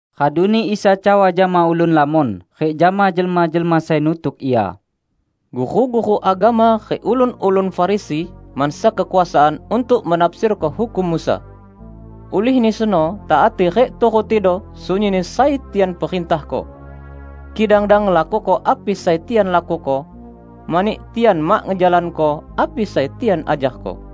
Raduni Isa cawa jama ulun lamon rik jama jelma-jelma sai nutuk Ia, "Guru-guru agama rik ulun-ulun Farisi mansa kekuasaan untuk menafsirko hukum Musa. Ulihni seno taati rik turutido sunyinni sai tian perintahko. Kidang dang ngelakuko api sai tian lakuko, mani tian mak ngejalanko api sai tian ajarko.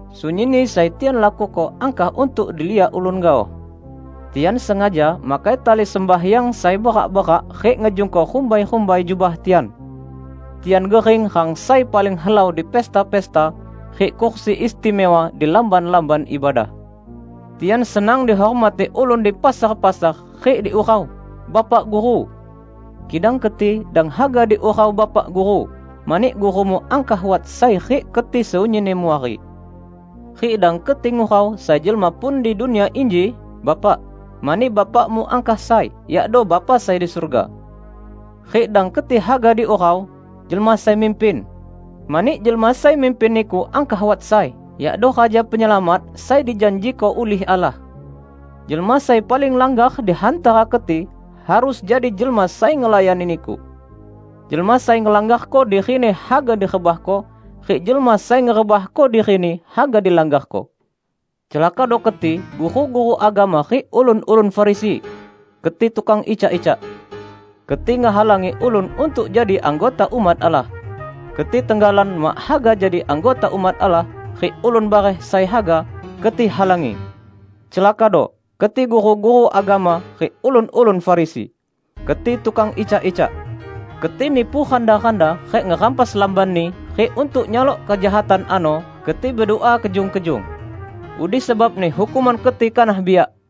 Sunyinni sai tian lakuko angkah untuk diliak ulun gaoh. Tian sengaja makai tali sembahyang sai berak-berak rik ngejungko rumbai-rumbai jubah tian! Tian gering rang sai paling helau di pesta-pesta, rik kursi istimewa di lamban-lamban ibadah. Tian senang dihormati ulun di pasar-pasar, rik diurau 'Bapak Guru'. Kidang keti, dang haga diurau 'Bapak Guru', mani Gurumu angkah wat sai rik keti sunyinni muari. Rik dang keti ngurau sai jelma pun di dunia inji 'Bapak', mani Bapakmu angkah sai, yakdo Bapa sai di surga. Rik dang keti haga diurau 'Jelma Sai Mimpin', mani jelma sai mimpin niku angkah wat sai, yakdo Raja Penyelamat sai dijanjiko ulih Allah. Jelma sai paling langgar di hantara keti, harus jadi jelma sai ngelayani niku. Jelma sai ngelanggarko dirini haga direbahko, rik jelma sai ngerebahko dirini haga dilanggarko." "Celakado keti guru-guru agama rik ulun-ulun Farisi! Keti tukang icak-icak. Keti ngehalangi ulun untuk jadi anggota umat Allah. Keti tenggalan mak haga jadi anggota umat Allah, rik ulun bareh sai haga, keti halangi! [ Celakado keti guru-guru agama rik ulun-ulun Farisi: Keti tukang icak-icak. Keti nipu randa-randa rik ngerampas lambanni rik untuk nyalok kejahatan ano keti bedua kejung-kejung. Udi sebabni hukuman keti kanah biak!]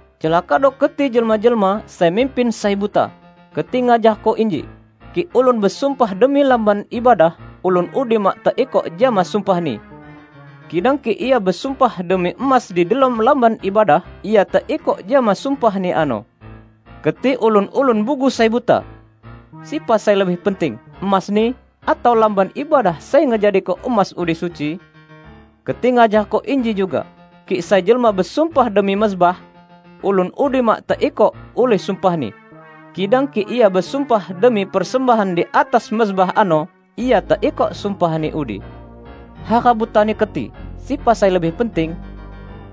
Celakado keti jelma-jelma sai mimpin sai buta! Keti ngajarko inji, 'Kik ulun besumpah demi Lamban Ibadah, ulun udi mak teikok jama sumpahni; kidang kik ia besumpah demi emas di delom Lamban Ibadah, ia teikok jama sumpahni ano.' Keti ulun-ulun bugu sai buta! Sepa sai lebih penting; emasni, atau Lamban Ibadah sai ngejadiko emas udi suci? Keti ngajarko inji juga, 'Kik sai jelma besumpah demi mezbah, ulun udi mak teikok ulih sumpahni, kidang kik ia besumpah demi persembahan di atas mezbah ano, ia teikok sumpahni udi.' Hara butani keti! Sepa sai lebih penting?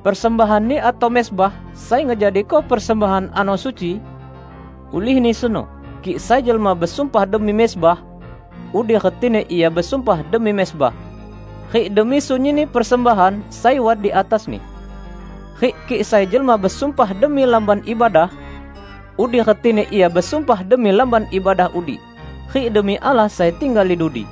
Persembahanni atau mezbah sai ngejadiko persembahan ano suci? Ulihni seno, kik sai jelma besumpah demi mezbah, udi retini ia besumpah demi mezbah, rik demi sunyinni persembahan sai wat di atasni. Rik kik sai jelma besumpah demi Lamban Ibadah, udi retini ia besumpah demi Lamban Ibadah udi, rik demi Allah sai tinggal di dudi.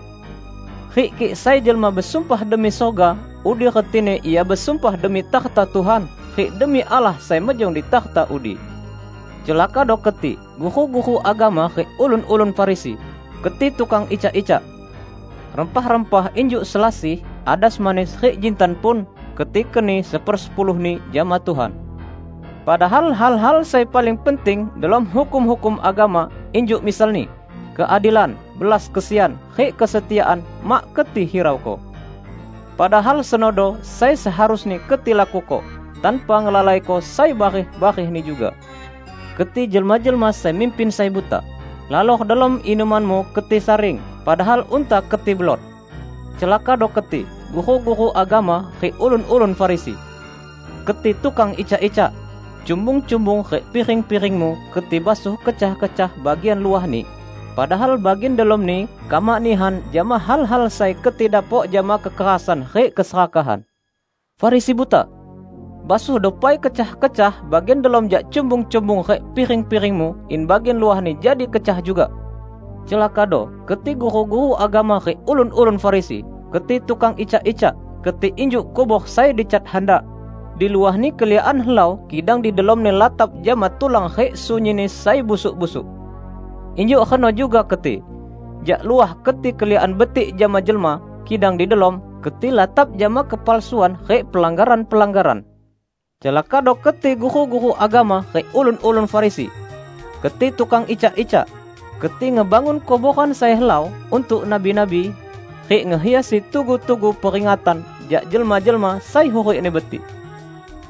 Rik kik sai jelma besumpah demi surga, udi retini ia besumpah demi takhta Tuhan, rik demi Allah sai mejong di takhta udi. Celakado keti guru-guru agama rik ulun-ulun Farisi! Keti tukang icak-icak. Rempah-rempah injuk selasih, adas manis, rik jintan pun, keti keni sepersepuluhni jama Tuhan. Padahal hal-hal sai paling penting delom hukum-hukum agama, injuk misalni: Keadilan, belas kesian, rik kesetiaan, mak keti hirauko. Padahal senodo sai seharusni keti lakuko, tanpa ngelalaiko sai bareh-barehni juga. Keti jelma-jelma sai mimpin sai buta! Lalar delom inumanmu keti saring, padahal unta keti belot! Celakado keti guru-guru agama rik ulun-ulun Farisi! Keti tukang icak-icak! Cumbung-cumbung rik piring-piringmu keti basuh kecah-kecah bagian luahni, padahal bagian delomni kamak nihan jama hal-hal sai keti dapok jama kekerasan rik keserakahan. Farisi buta! Basuhdo pai kecah-kecah bagian delom jak cumbung-cumbung rik piring-piringmu, in bagian luahni jadi kecah juga! Celakado keti guru-guru agama rik ulun-ulun Farisi! Keti tukang icak-icak! Keti injuk kubor sai dicat handak; di luahni keliakan helau, kidang di delomni latap jama tulan rik sunyinni sai busuk-busuk. Injuk reno juga keti. Jak luah keti keliakan betik jama jelma; kidang di delom, keti latap jama kepalsuan rik pelanggaran-pelanggaran." "Celakado keti guru-guru agama rik ulun-ulun Farisi! Keti tukang icak-icak! Keti ngebangun kuboran sai helau untuk nabi-nabi, rik ngehiasi tugu-tugu peringatan jak jelma-jelma sai hurikni betik.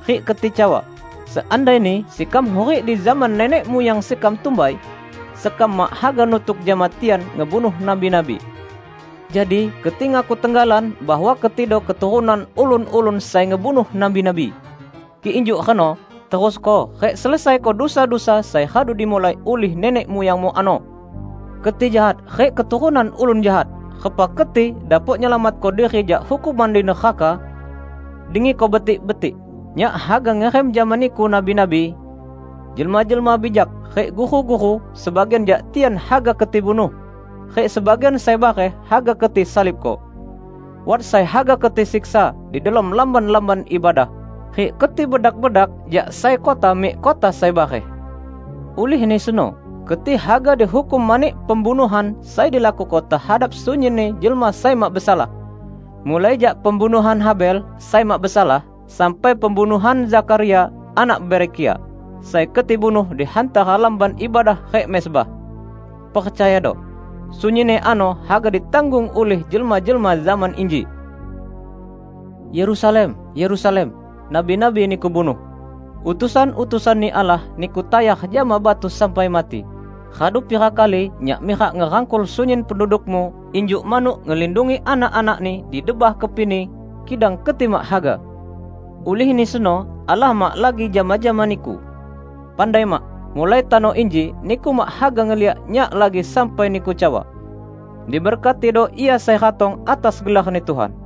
Rik keti cawa, 'Seandaini sekam hurik di zaman nenek muyang sekam tumbai, sekam mak haga nutuk jama tian ngebunuh nabi-nabi.' Jadi keti ngaku tenggalan bahwa ketido keturunan ulun-ulun sai ngebunuh nabi-nabi! Kik injuk reno, terusko rik selesaiko dusa-dusa sai radu dimulai ulih nenek muyangmu ano! Keti jahat rik keturunan ulun jahat! Repa keti dapok nyelamatko diri jak hukuman di neraka? Dengiko betik-betik: Nyak haga ngirim jama niku nabi-nabi, jelma-jelma bijak, rik guru-guru; sebagian jak tian haga keti bunuh, rik sebagian sai bareh haga keti salibko. Wat sai haga keti siksa di delom lamban-lamban ibadah, rik keti bedak-bedak jak sai kota mik kota sai bareh. Ulihni seno, keti haga dihukum mani pembunuhan sai dilakuko tehadap sunyinni jelma sai mak besalah -- mulai jak pembunuhan Habel sai mak besalah, sampai pembunuhan Zakharia anak Berekia, sai keti bunuh di hantara Lamban Ibadah rik mezbah. Percayado: Sunyinni ano haga ditanggung ulih jelma-jelma zaman inji!" "Yerusalem, Yerusalem! Nabi-nabi niku bunuh. Utusan-utusan-Ni Allah niku tayar jama batu sampai mati. Radu pira kali Nyak mirak ngerangkul sunyin pendudukmu injuk manuk ngelindungi anak-anakni di bah kepini, kidang keti mak haga! Ulihni seno Allah mak lagi jama-jama niku. Pandai mak: Mulai tano inji niku mak haga ngeliak Nyak lagi sampai niku cawa, 'Diberkatido Ia sai ratong atas gelarni Tuhan.' "